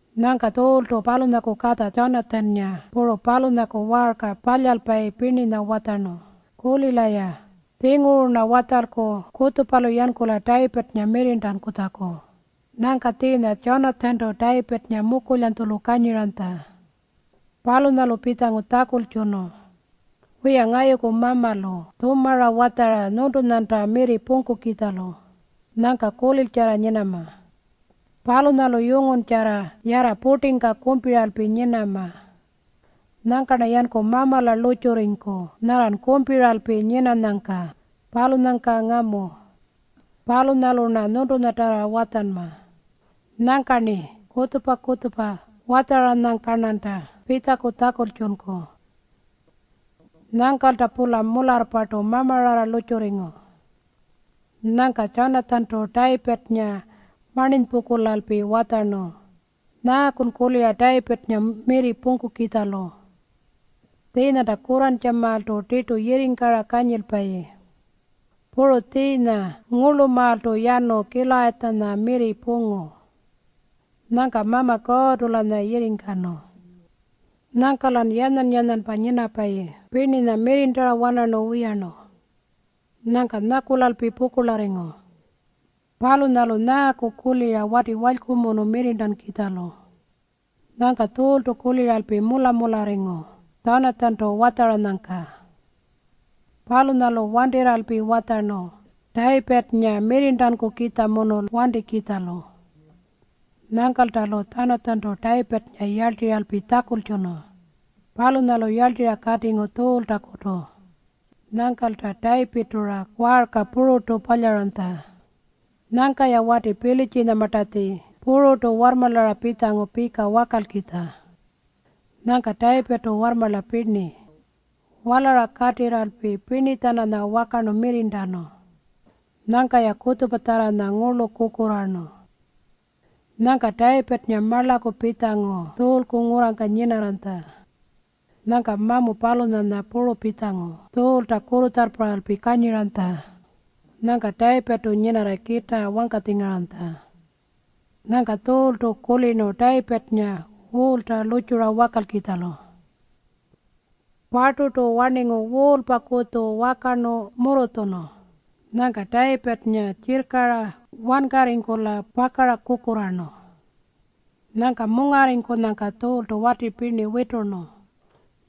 Nyangka Tjuultu palunyaku katja Tjanatjannga puru palunyaku waarka palyalpayi pirninya watjarnu, “Kulila-ya. Tjinguru-rna watjalku kutjupalu yankula Tayipirrnga mirrirntankutjaku.” Nyangka tjiinya Tjanatjantu Tayipirrnga mukulyanytjulu kanyiranytja. Palunyalu pitjangu tjakultjunu, “Wiya, ngayuku mamalu tjumara watjara nyuntunyanta mirri pungkukitjalu. Nyangka kuliltjarra nyinama. Palunyalu yunguntjarra yarra purtingka kumpiralpi nyinama. Nyangka-rna yanku Mamala lurrtjurriku nyarran kumpiralpi nyinanyangka, palunyangka ngamu. Palunyalu-rna nyuntunyatjarra watjanma. Nyangka-rni kutjupa-kutjupa watjaranyangka-rnanta pitjaku tjakultjunku.” Nyangkalta-pula mularrpartu mamararra lurrtjurringu. Nyangka Tjanatjantu Tayipirrnga marninypungkulalpi watjarnu, “Nyaakun kulira Tayipirrnga mirri pungkukitjalu? Tjiinyanta kurrantjamaaltu tirtu yirringkara kanyilpayi. Puru tjiinya ngurlumaaltu yanu Kilayatjanya mirri pungu. Nyangka Mama Kuurrtu-lanya yirringkanu. Nyangka-lan yanyan-yanyanpa nyinapayi pirninya mirrirntara-wanarnu wiyarnu. Nyangkan nyakulalpi pukurlarringu. Palunyalun nyaaku kulira wati walykumunu mirrirntankukitjalu?” Nyangka Tjuultu kuliralpi mula-mularringu Tjanatjantu watjaranyangka. Palunyalu wantirralpi watjarnu Tayipirrnga mirrirntankukitjamunu wantikitjalu. Nyangkalta-lu Tjanatjantu Tayipirrnga yarltirralpi tjakultjunu. Palunyalu yarltirra katingu Tjuultakutu. Nyangkalta Tayipirrtu-ra waarka pururtu palyaranytja. Nyangka-ya wati Pilitjinyamartatji pururtu warrmarlara pitjangu pika wakalkitja. Nyangka Tayipirrtu warrmarla pirni walara katirralpi pirni-tjananya wakarnu mirrirntanu. Nyangka-ya kutjupatjarranya ngurlu kukurraarnu. Nyangka Tayipirrnga marlaku pitjangu Tjuulku ngurrangka nyinarranytja. Nyangka mamu palunyanya puru pitjangu Tjuulta kurrutjarrparralpi kanyiranytja. Nyangka Tayipirrtu nyinarra kitaa wangkatjingaranytja. Nyangka Tjuultu kulirnu Tayipirrnga wuulta lurrtjura wakalkitjalu. Parturtu warningu wuulpakutju wakarnu murrutjunu. Nyangka Tayipirrnga tjirrkara wankarringkula pakara kukurraarnu. Nyangka mungarringkunyangka Tjuultu wati pirni witurnu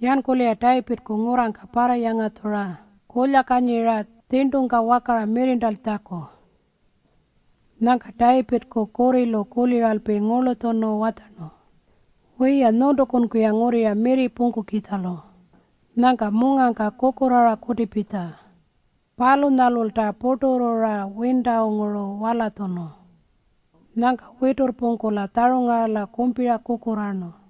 yankula-ya Tayipirrku ngurrangka parrayangatjura kulyakanyira tjirntungka wakara mirrirntankutjaku. Nyangka Tayipirrku kurrilu kuliralpi ngurlutjunu watjarnu, “Wiya, nyuntukunku-ya ngurrira mirri pungkukitjalu. Nyangka mungangka kukurraara kutipitja.” Palunyalulta purturru-ra wintanguru walatjunu. Nyangka witurrpungkula tjarungarala kumpira kukurraarnu.